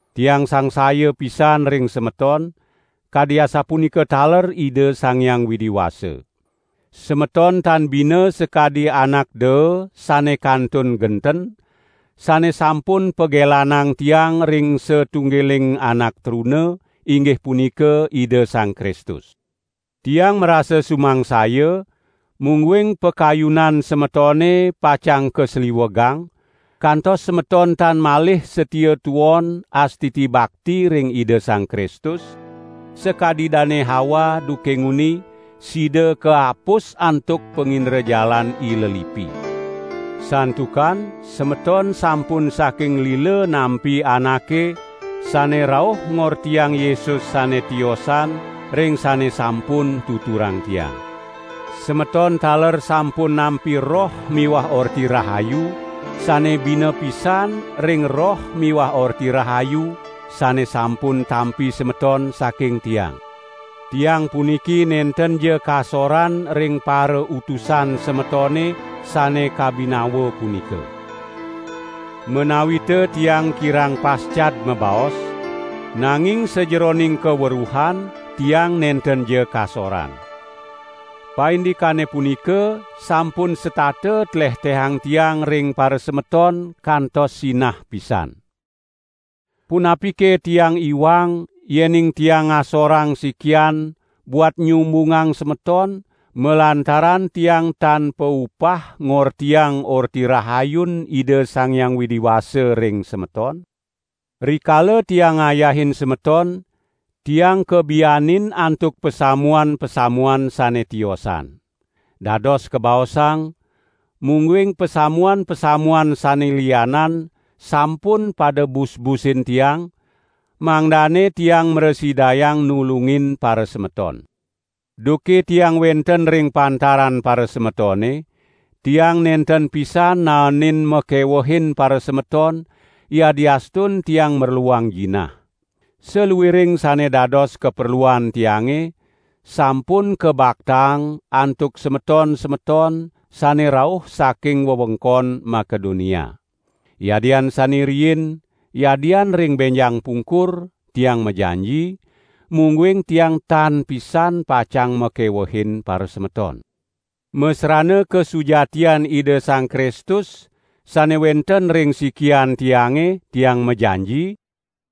Tiang sangsaya pisan ring semeton, kadi asapunika taler Ida Sang Hyang Widi Wasa. Semeton tan bina sakadi anak daa sane kantun genten, sane sampun pagelanang tiang ring satunggiling anak truna, inggih punika Ida Sang Kristus. Tiang marasa sumangsaya, mungguing pakayunan semetone pacang kasliwegang, kantos semeton tan malih satia tuon astiti bakti ring Ida Sang Kristus, sakadi Dane Hawa duke nguni, sida kaapus antuk pangindrajalan ilelipi. Santukan semeton sampun saking lila nampi anake sane rauh ngortiang Yesus sane tiosan ring sane sampun tuturang tiang. Semeton taler sampun nampi roh miwah orti rahayu sane bina pisan ring Roh miwah Orti Rahayu sane sampun tampi semeton saking tiang. Tiang puniki nentenja kasoran ring "parautusan" semetone sane kabinawa punika. Menawita tiang kirang pascad mabaos, nanging sajeroning kaweruhan tiang nentenja kasoran. Paindikane punika sampun setata tlehtehang tiang ring parasemeton kantos sinah pisan! Punapike tiang iwang yening tiang ngasorang sikian buat nyumbungang semeton malantaran tiang tan paupah ngortiang Orti Rahayun Ida Sang Hyang Widi Wasa ring semeton? Rikala tiang ngayahin semeton, tiang kabianin antuk pasamuan-pasamuan sane tiosan. Dados kabaosang, mungguing pasamuan-pasamuan sane lianan sampun pada bus-busin tiang, mangdane tiang mrasidayang nulungin parasemeton! Duke tiang wenten ring pantaran parasemetone, tiang nenten pisan naenin makewuhin parasemeton yadiastun tiang merluang jinah. Saluiring sane dados kaperluan tiange, sampun kabaktaang antuk semeton-semeton sane rauh saking wewengkon Makedonia. Yadian sane riin, yadian ring benjang pungkur, tiang majanji, mungguing tiang tan pisan pacang makewehin parasemeton. Masrana kasujatian Ida Sang Kristus sane wenten ring sikian tiange, tiang majanji,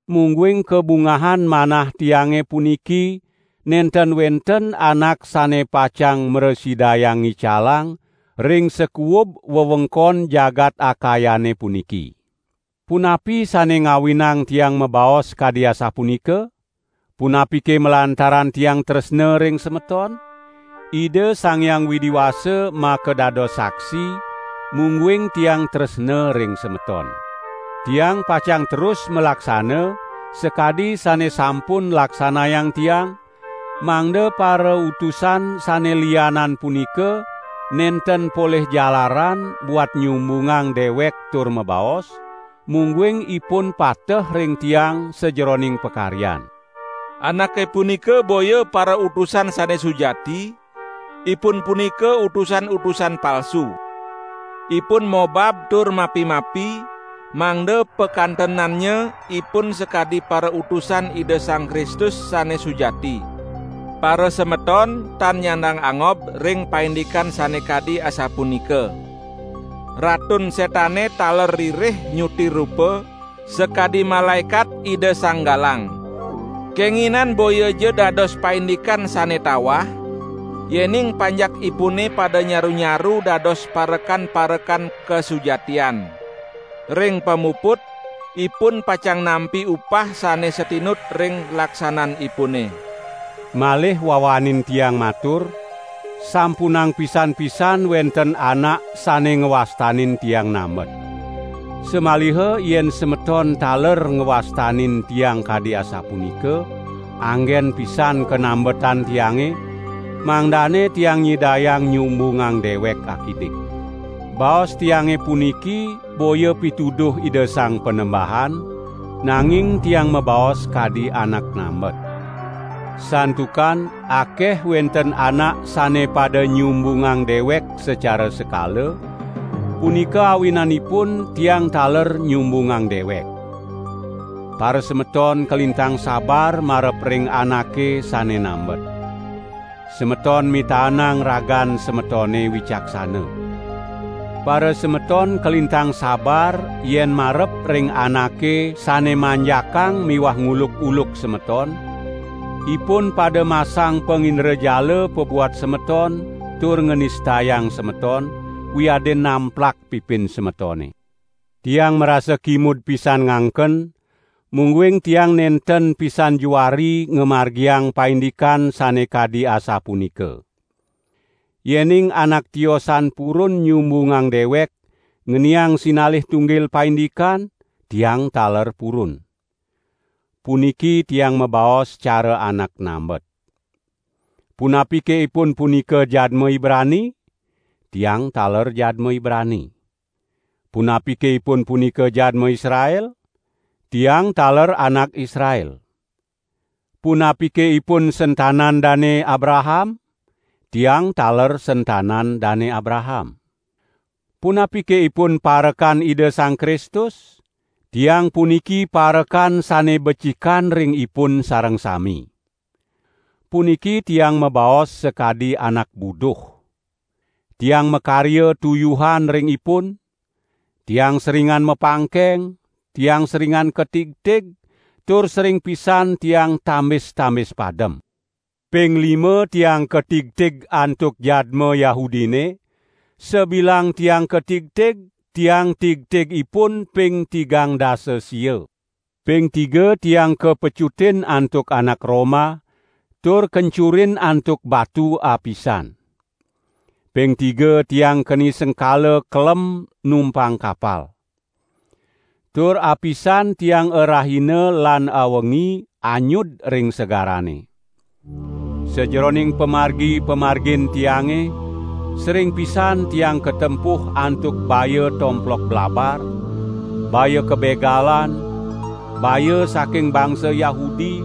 mungguing kabungahan manah tiange puniki nenten wenten anak sane pacang mrasidayang ngicalang ring sakuub wewengkon jagat Akayane puniki. Punapi sane ngawinang tiang mabaos kadi asapunika? Punapike malantaran tiang tresna ring semeton? Ida Sang Hyang Widi Wasa makadados saksi, mungguing tiang tresna ring semeton. Tiang pacang terus malaksana, sakadi sane sampun laksanayang tiang, mangda "parautusan" sane lianan punika nenten polih jalaran buat nyumbungang dewek tur mabaos, mungguing ipun pateh ring tiang sajeroning pakaryan. Anake punika boya parautusan sane sujati, ipun punika utusan-utusan palsu. Ipun mobab tur mapi-mapi, mangda pakantenannya ipun sakadi parautusan Ida Sang Kristus sane sujati. Parasemeton tan nyandang angob ring paindikan sane kadi asapunika. Ratun Setane taler ririh nyuti rupa sakadi malaekat Ida Sang Galang. Kenginan boyaja dados paindikan sane tawah, yening panjakipune pada nyaru-nyaru dados parekan-parekan kasujatian. Ring pamuput ipun pacang nampi upah sane satinut ring laksananipune. Malih wawanin tiang matur, sampunang pisan-pisan wenten anak sane ngwastanin tiang nambet. Samaliha yen semeton taler ngwastanin tiang kadi asapunika, anggen pisan kanambetan tiange, mangdane tiang nyidayang nyumbungang dewek akidik. Baos tiange puniki, boya pituduh Ida Sang Panembahan, nanging tiang mabaos kadi anak nambet. Santukan akeh wenten anak sane pada nyumbungang dewek sacara sekala, punika awinanipun tiang taler nyumbungang dewek. Parasemeton kalintang sabar marep ring anake sane nambet. Semeton mitaenang ragan semetone wicaksana. Parasemeton kalintang sabar yen marep ring anake sane manjakang miwah nguluk-uluk semeton; ipun pada masang pangindrajala pabuat semeton tur nganistayang semeton, wiadin namplak pipin semetone. Tiang marasa kimud pisan ngangken, mungguing tiang nenten pisan juari ngamargiang paindikan sane kadi asapunika. Yening anak tiosan purun nyumbungang dewek ngeniang sinalih tunggil paindikan, tiang taler purun. Puniki tiang mabaos cara anak nambet. Punapike ipun punika jadma Ibrani? Tiang taler jadma Ibrani! Punapike ipun punika jadma Israel? Tiang taler anak Israel! Punapike ipun sentanan Dane Abraham? Tiang taler sentanan Dane Abraham! Punapike ipun parekan Ida Sang Kristus, tiang puniki parekan sane becikan ring ipun sareng sami! Puniki tiang mabaos sakadi anak buduh! Tiang makarya tuyuhan ring ipun; tiang seringan mapangkeng; tiang seringan katigtig, tur sering pisan tiang tambis-tambis padem. Ping lima tiang katigtig antuk jadma Yahudine, sabilang tiang katigtig tiang tigtig ipun ping tigang dasa sia. Ping tiga tiang kapecutin antuk anak Roma, tur kencurin antuk batu apisan. Ping tiga tiang keni sengkala kelem numpang kapal. Tur apisan tiang arahina lan awengi anyud ring segarane. Sajeroning pamargi-pamargin tiange, sering pisan tiang katempuh antuk baya tomplok blabar, baya kabegalan, baya saking bangsa Yahudi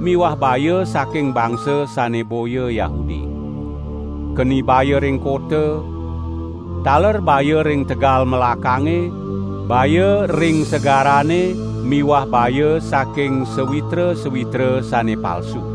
miwah baya saking bangsa sane boya Yahudi. Keni baya ring kota, taler baya ring tegal melakange, baya ring segarane miwah baya saking sawitra-sawitra sane palsu.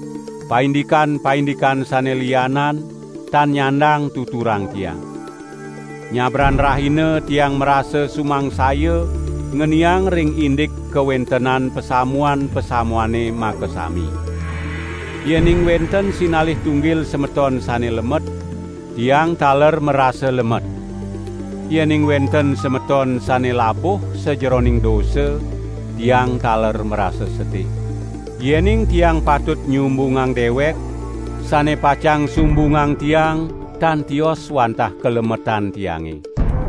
Paindikan-paindikan sane lianan, tan nyandang tuturang tiang. Nyabran rahina tiang marasa sumangsaya ngeniang ring indik kawentenan pasamuan-pasamuane makasami. Yening wenten sinalih tunggil semeton sane lemet, tiang taler marasa lemet. Yening wenten semeton sane labuh sajeroning dosa, tiang taler marasa sedih. Yening tiang patut nyumbungang dewek, sane pacang sumbungang tiang tan tios wantah kalemetan tiange.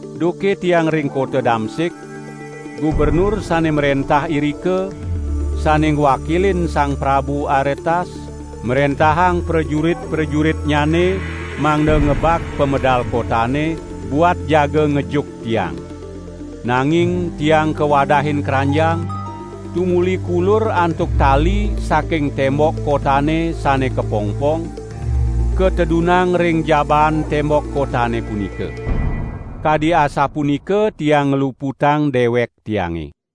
Duke tiang ring kota Damsik, gubernur sane mrentah irika, sane ngwakilin Sang Prabu Aretas, mrentahang prajurit-prajuritnyane mangda ngebag pamedal kotane, buat jaga ngejuk tiang. Nanging tiang kawadahin kranjang, tumuli kulur antuk tali saking tembok kotane sane kapongpong, katedunang ring jabaan tembok kotane punika. Kadi asapunika tiang ngluputang dewek tiange.